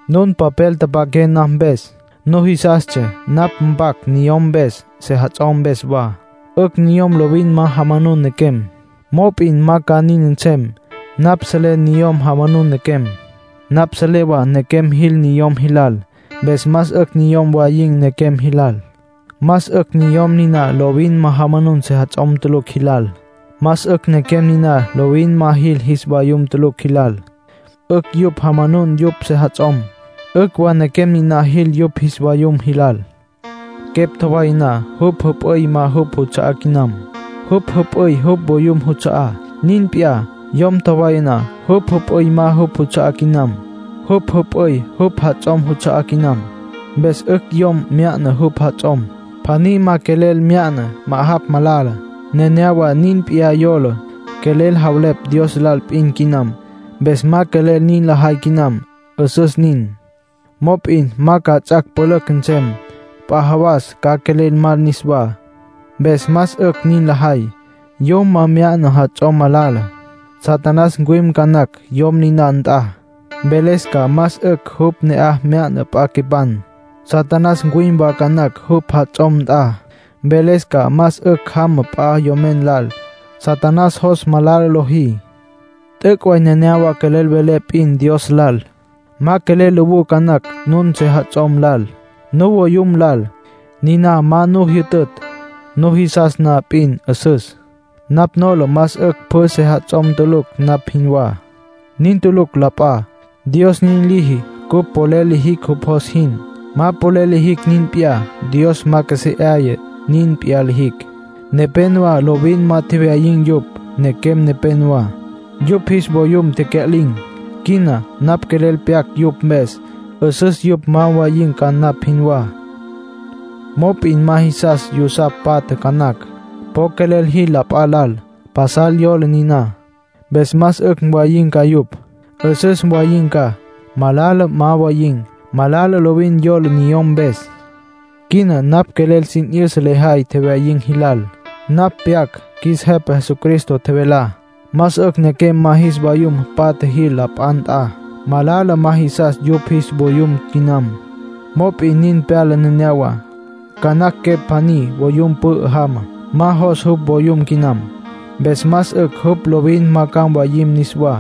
Nun papel tapaqué napj mpes. Nujisastsja napj mpac niyom mpes, sejats'om mpes wa. 'Ücj niyom lovin ma jamanun nequem. Mop'in ma ca nin nsem. Napj selé niyom jamanun nequem. Napj selé wa nequem jil niyom jilal. Mpes más 'ücj niyom mwayin̈ nequem jilal. Más 'ücj niyom niná lovin ma jamanun sejats'om tulucj jilal. Más 'ücj nequem niná lovin ma jil jis vayum tulucj jilal. 'Ücj yupj jamanun yupj sejats'om. 'Ücj wa nequem niná jil yupj jis vayum jilal. Quepj tjowaya na, jupj jüp'üy ma jupj juts'a'á quinam. Jupj jüp'üy jupj voyum juts'a'á. Nin p'iyá, yom tjowaya na, jupj jüp'üy ma jupj juts'a'á quinam. Jupj jüp'üy jupj jats'om juts'a'á quinam. Mpes 'ücj yom mya'na jupj jats'om. Pjaní ma quelel mya'na ma'ajapj, malala. Nenéyawa nin p'iyá yola, quelel javelepj Dios lal p'in quinam, mpes ma quelel nin lajay quinam. 'Üsüs nin. Mop'in ma ca ts'ac' pülücj nsem. P'a jawas ca quelel mal niswá. Mpes más 'ücj nin lajay. Yom ma mya'na jats'om, malala. Satanás ncuwim ca nacj yom niná nt'a, mveles ca más 'ücj jupj ne'aj mya'na p'a quepan. Satanás ncuwim wa ca nacj jupj jats'om nt'a, mveles ca más 'ücj jama p'a yomen lal. Satanás jos malala lojí. T'üc' way nenéyawa quelel welé p'in Dios lal; ma quelel lowú ca nacj nun sejats'om lal, nuvoyum lal. Niná ma nu jyütütj; nujisas na p'in, 'üsüs. Napj nola más 'ücj pjü sejats'om tulucj, napj jinwá. Nin tulucj la p'a. Dios nin liji cupj polel lijicj jupj jos jin. Ma polel lijicj nin p'iyá. Dios ma qjuesé 'aya nin p'iyá lijicj. Nepénowa lovin ma tjewyayin̈ yupj. Nequem nepénowa, yupj jis vayum tecya'lin̈. Quina napj quelel pyac yupj mpes. 'Üsüs yupj ma mwayin̈ ca, napj jinwá. Mop'in ma jisas yusapj mpatjam ca nacj. Po quelel jil p'a lal. Pasal yola niná. Mpes más 'ücj mwayin̈ ca yupj. 'Üsüs mwayin̈ ca. Malala ma mwayin̈; malala lovin yola niyom mpes. Quina napj quelel sin 'yüsa lejay tjewyayin̈ jilal. Napj pyac qjuis Jepa Jesucristo tjevelá. Más 'ücj nequem ma jis vayum patja jil la p'a nt'a. Malala ma jisas yupj jis vayum quinam. Mop'in nin pyala neneyawá. Ca nacj quepj pjaní voyum pü'ü jama, ma jos jupj voyum quinam. Mpes más 'ücj jupj lovin ma ca mwayim niswá.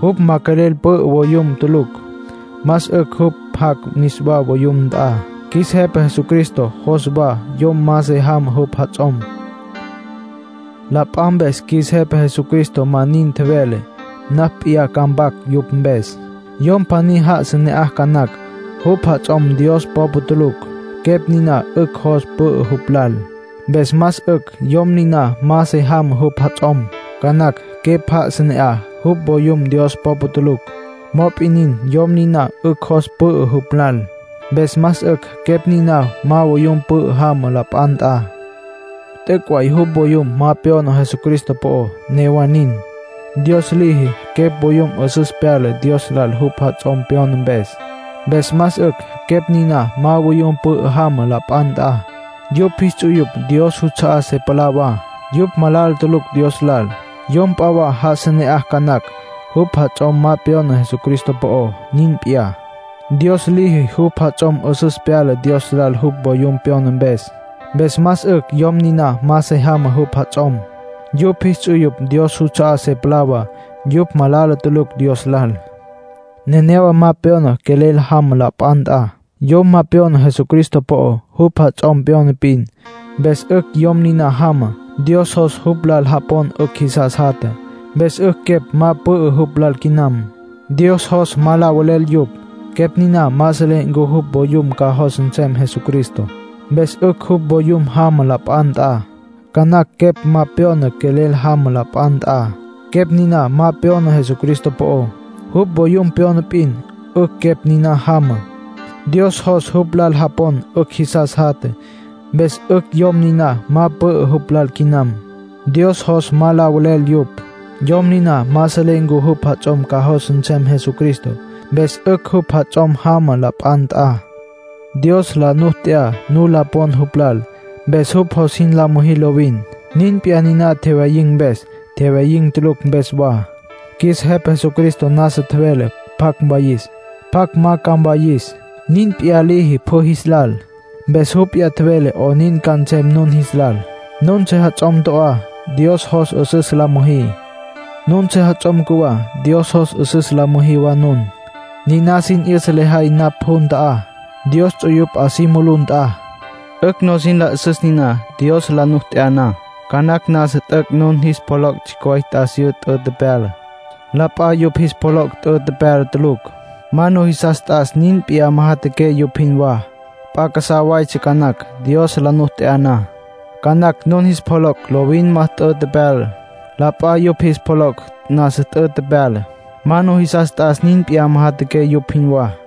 Jupj ma quelel pü'ü voyum tulucj, más 'ücj jupj jac' niswá voyum nt'a. Qjuis Jepa Jesucristo jos wa yom ma se jamá jupj jats'om. La p'a mpes qjuis Jepa Jesucristo ma nin tjevele. Napj p'iyá ca mpac yupj mpes. Yom pjaní já'asa ne'aj ca nacj, jupj jats'om Dios popa tulucj. Quepj niná 'ücj jos pü'ü jupj lal. Mpes más 'ücj yom niná ma se jamá jupj jats'om. Ca nacj quepj já'asa ne'aj, jupj voyum Dios popa tulucj. Mop'in nin, yom niná 'ücj jos pü'ü jupj lal. Mpes más 'ücj quepj niná ma voyum pü'ü jama la p'a nt'a. T'üc' way jupj voyum ma pyona Jesucristo po'ó. Newa nin, Dios liji quepj voyum 'üsüs pyala Dios lal jupj jats'om pyona mpes. Mpes más 'ücj quepj niná ma voyum pü'ü jama la p'a nt'a. Yupj jis ts'uyupj Dios juts'a'á se palá wa. Yupj malala tulucj Dios lal. Yom p'a wa já'asa ne'aj ca nacj, jupj jats'om ma pyona Jesucristo po'ó. Nin p'iyá, Dios liji jupj jats'om 'üsüs pyala Dios lal jupj voyum pyona mpes. Mpes más 'ücj yom niná ma se jamá jupj jats'om. Yupj jis ts'uyupj Dios juts'a'á se palá wa. Yupj malala tulucj Dios lal. Nenéyawa ma pyona quelel jama la p'a nt'a. Yom ma pyona Jesucristo po'ó, jupj jats'om pyona p'in. Mpes 'ücj yom niná jama. Dios jos jupj lal japon 'ücj jisas jatja, mpes 'ücj quepj ma pü'ü jupj lal quinam. Dios jos ma la velel yupj. Quepj niná ma selé ncu jupj voyum ca jos nsem Jesucristo. Mpes 'ücj jupj voyum jama la p'a nt'a. Ca nacj quepj ma pyona quelel jama la p'a nt'a. Quepj niná ma pyona Jesucristo po'ó, jupj voyum pyona p'in. 'Ücj quepj niná jama. Dios jos jupj lal japon 'ücj jisas jatja, mpes 'ücj yom niná ma pü'ü jupj lal quinam. Dios jos ma la velel yupj. Yom niná ma selé ncu jupj jats'om ca jos nsem Jesucristo. Mpes 'ücj jupj jats'om jama la p'a nt'a. Dios la nu t'ya nu la pon jupj lal, mpes jupj jos jin la müjí lovin. Nin p'iyá niná tjewyayin̈ mpes, tjewyayin̈ tulucj mpes wa. Qjuis Jepa Jesucristo nasa tjevele pjacj mwayis, pjacj ma ca mwayis. Nin p'iyá liji pjü jis lal. Mpes jupj p'iyá tjevele 'onin ca nsem nun jis lal. Nun sejats'om to'á, Dios jos 'üsüs la müjí. Nun sejats'om cjuwá, Dios jos 'üsüs la müjí wa nun. Niná sin 'yüsa lejay napj jun ta'á, Dios ts'uyupj 'a si mulú nt'a. 'Ücj nusin la 'üsüs niná. Dios la nu t'ya na, ca nacj nasa t'üc' nun jis pjoloc' tsjicj way t'asiyú t'ü tepyala. La p'a yupj jis pjoloc' t'ü tepyala tulucj. Ma nujisas t'as nin p'iyá majatjaqué yupj jinwá. P'a casá waytsja ca nacj. Dios la nu t'ya na, ca nacj nun jis pjoloc' lovin ma t'ü tepyala. La p'a yupj jis pjoloc' nasa t'ü tepyala. Ma nujisas t'as nin p'iyá majatjaqué yupj jinwá.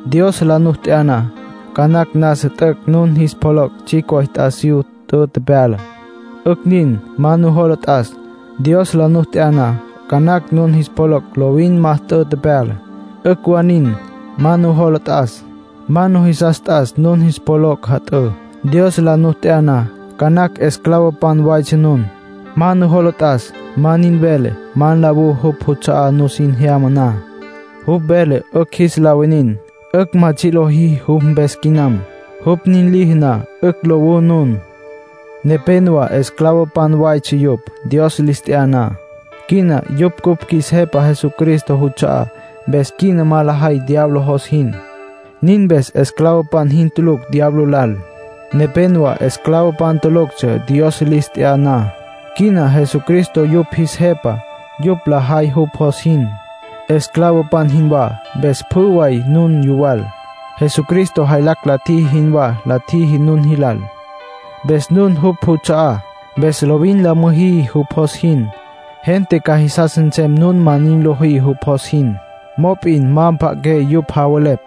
Dios la nu t'ya na, ca nacj nasa t'üc' nun jis pjoloc' tsjicj way t'asiyú t'ü tepyala. 'Ücj nin. Ma nujola t'as. Dios la nu t'ya na, ca nacj nun jis pjoloc' lovin ma t'ü tepyala. 'Ücj wa nin. Ma nujola t'as. Ma nujisas t'as nun jis pjoloc' jat'ǘ. Dios la nu t'ya na, ca nacj esclavopan waytsja nun. Ma nujola t'as. Ma nin velé ma nlawú jupj juts'a'á nusin jyama na. Jupj vele 'ücj jis la winin, 'ücj ma tsji' lojí jupj mpes quinam. Jupj nin liji na, 'ücj lowú nun. Nepénowa esclavopan waytsja yupj, Dios lis t'ya na. Quina yupj cupj qjuis Jepa Jesucristo juts'a'á. Mpes quina ma lajay diablo jos jin. Nin mpes esclavopan jin tulucj diablo lal. Nepénowa esclavopan tuluctsja Dios lis t'ya na. Quina Jesucristo yupj jis Jepa; yupj lajay jupj jos jin, esclavopan jinwá. Mpes pjü way nun yuwal. Jesucristo jaylacj la tjiji jinwá la tjiji nun jilal. Mpes nun jupj juts'a'á. Mpes lovin la müjí jupj jos jin. Gente ca jisas nsem nun ma nin lojí jupj jos jin. Mop'in ma mpja'aqué yupj javelepj.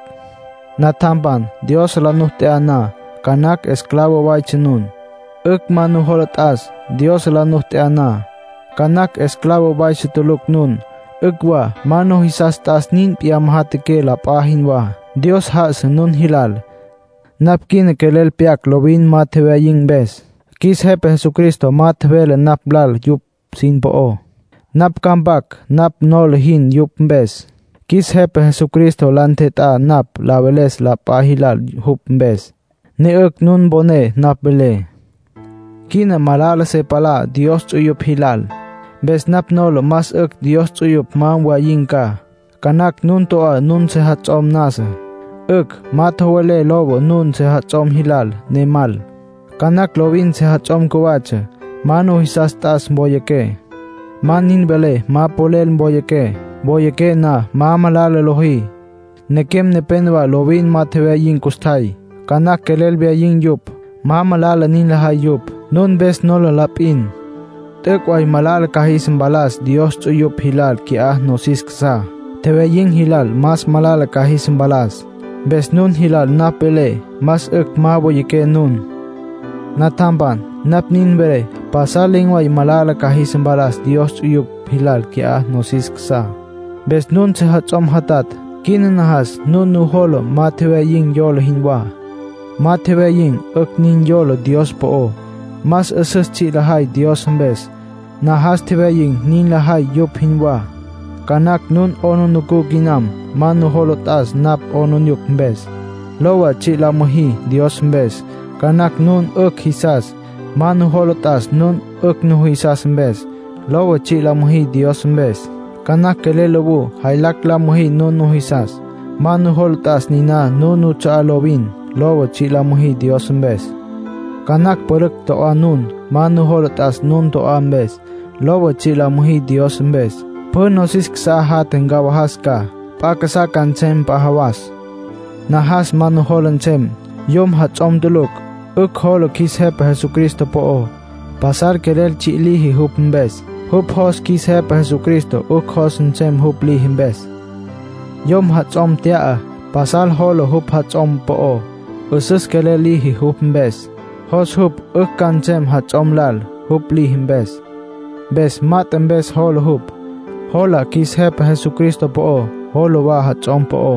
Natjampan, Dios la nu t'ya na, ca nacj esclavo waytsja nun. 'Ücj, ma nujola t'as. Dios la nu t'ya na, ca nacj esclavo waytsja tulucj nun. 'Ücj wa. Ma nujisas t'as nin p'iyá majatjaqué la p'a jinwá. Dios já'asa nun jilal. Napj quina quelel pyac lovin ma tjewyayin̈ mpes. Qjuis Jepa Jesucristo ma tjevele napj lal yupj sin po'ó. Napj ca mpac napj nola jin yupj mpes. Qjuis Jepa Jesucristo la ntjet'á napj la veles la p'a jilal jupj mpes, ne 'ücj nun mponé napj velé. Quina malala se palá Dios ts'uyupj jilal. Mpes napj nola más 'ücj Dios ts'uyupj ma mwayin̈ ca. Ca nacj nun to'á nun sejats'om nasa. 'Ücj. Ma tjowelé lowa nun sejats'om jilal ne mal. Ca nacj lovin sejats'om cjuwatsja. Ma nujisas t'as woyaqué. Ma nin velé ma polel woyaqué. Woyaqué na, ma malala lojí. Nequem nepénowa lovin ma tjewyayin̈ custjay. Ca nacj quelel wyayin̈ yupj. Ma malala nin lajay yupj. Nun mpes nola la p'in. T'üc' way malala ca jis mpalas Dios ts'uyupj jilal qui'á nosis casá. Tjewyayin̈ jilal más malala ca jis mpalas. Mpes nun jilal napj velé más 'ücj ma woyaqué nun. Natjampan, napj nin velé pasal len̈ way malala ca jis mpalas Dios ts'uyupj jilal qui'á nosis casá. Mpes nun sejats'om jatatj, quina najas nun nujola ma tjewyayin̈ yola jinwá. Ma tjewyayin̈ 'ücj nin yola Dios po'ó. Más 'üsüs tsji' lajay Dios mpes. Najas tjewyayin̈ nin lajay yupj jinwá. Ca nacj nun 'aplijila quinam. Ma nujola t'as nun 'aplijila mpes. Lowa, tsji' la müjí Dios mpes. Ca nacj nun 'ücj jisas. Ma nujola t'as nun 'ücj nujisas mpes. Lowa, tsji' la müjí Dios mpes. Ca nacj quelel lowú, jaylacj la müjí nun nujisas. Ma nujola t'as niná nun nuts'a'á lovin. Lowa, tsji' la müjí Dios mpes. Ca nacj pülücj to'á nun. Ma nujola t'as nun to'á mpes. Lowa, tsji' la müjí Dios mpes. Pjü nosis casá jatja ncawajas ca. P'a casá ca nsem p'a jawas. Najas ma nujola nsem. Yom jats'om tulucj, 'ücj jola qjuis Jepa Jesucristo po'ó. Pasal quelel tsji' liji jupj mpes. Jupj jos qjuis Jepa Jesucristo 'ücj jos nsem jupj liji mpes. Yom jats'om tya'a, pasal jola jupj jats'om po'ó. 'Üsüs quelel liji jupj mpes. Jos jupj 'ücj ca nsem jats'om lal, jupj liji mpes. Mpes mat'e mpes jola jupj. Jola qjuis Jepa Jesucristo po'ó, jola wa jats'om po'ó.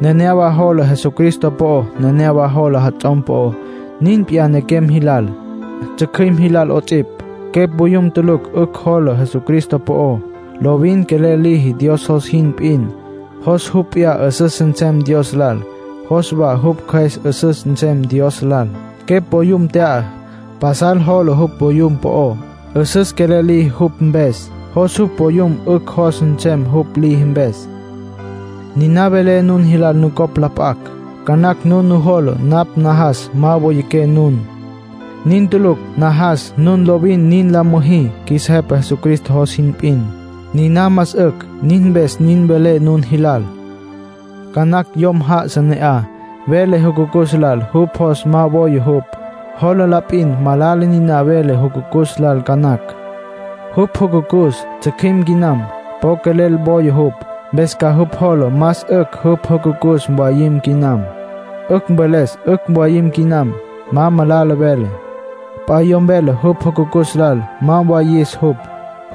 Nenéyawa jola Jesucristo po'ó, nenéyawa jola jats'om po'ó. Nin p'iyá nequem jilal, tsjücjüim jilal 'ots'ipj. Quepj voyum tulucj 'ücj jola Jesucristo po'ó. Lovin quelel liji Dios jos jin p'in. Jos jupj p'iyá 'üsüs nsem Dios lal, jos wa jupj cjües 'üsüs nsem Dios lal. Quepj voyum tya'a, pasal jola jupj voyum po'ó. 'Üsüs quelel liji jupj mpes. Jos jupj voyum 'ücj jos nsem jupj liji mpes. Niná velé nun jilal nucopj la p'acj. Ca nacj nun nujola napj najas ma woyaqué nun. Nin tulucj. Najas nun lovin nin la müjí qjuis Jepa Jesucristo jos jin p'in. Niná más 'ücj. Nin mpes nin velé nun jis lal. Ca nacj yom já'asa ne'aj, vele jucucus lal jupj jos ma woya jupj. Jola la p'in malala niná vele jucucus lal ca nacj. Jupj jucucus tsjücjüim quinam, po quelel woya jupj. Mpes ca jupj jola más 'ücj jupj jucucus mwayim quinam. 'Ücj mveles 'ücj mwayim quinam. Ma malala vele. P'a yom vele jupj jucucus lal ma mwayis jupj.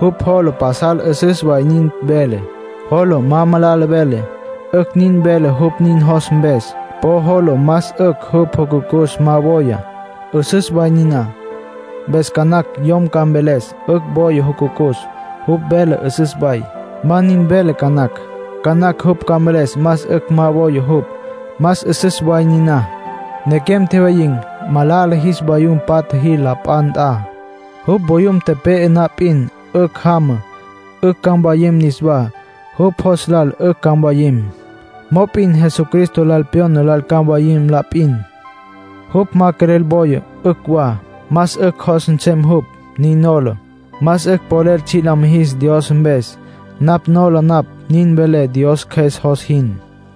Jupj jola pasal 'üsüs way nin vele, jola ma malala vele. 'Ücj nin vele jupj nin jos mpes. Po jola más 'ücj jupj jucucus ma woya. 'Üsüs way niná. Mpes ca nacj yom ca mveles 'ücj woya jupj jucucus. Jupj vele 'üsüs way. Ma nin vele ca nacj. Ca nacj jupj ca mveles más 'ücj ma woya jupj. Más 'üsüs way niná. Nequem tjewyayin̈, malala jis vayum patja jil la p'a nt'a. Jupj voyum tepe'e na p'in, 'ücj jama. 'Ücj ca mwayim niswá. Jupj jos lal 'ücj ca mwayim. Mop'in Jesucristo lal pyona lal ca mwayim la p'in. Jupj ma quelel woya, 'ücj wa. Más 'ücj jos nsem jupj, nin nola. Más 'ücj polel tsji' la mijis Dios mpes. Napj nola napj nin velé Dios Cjües jos jin.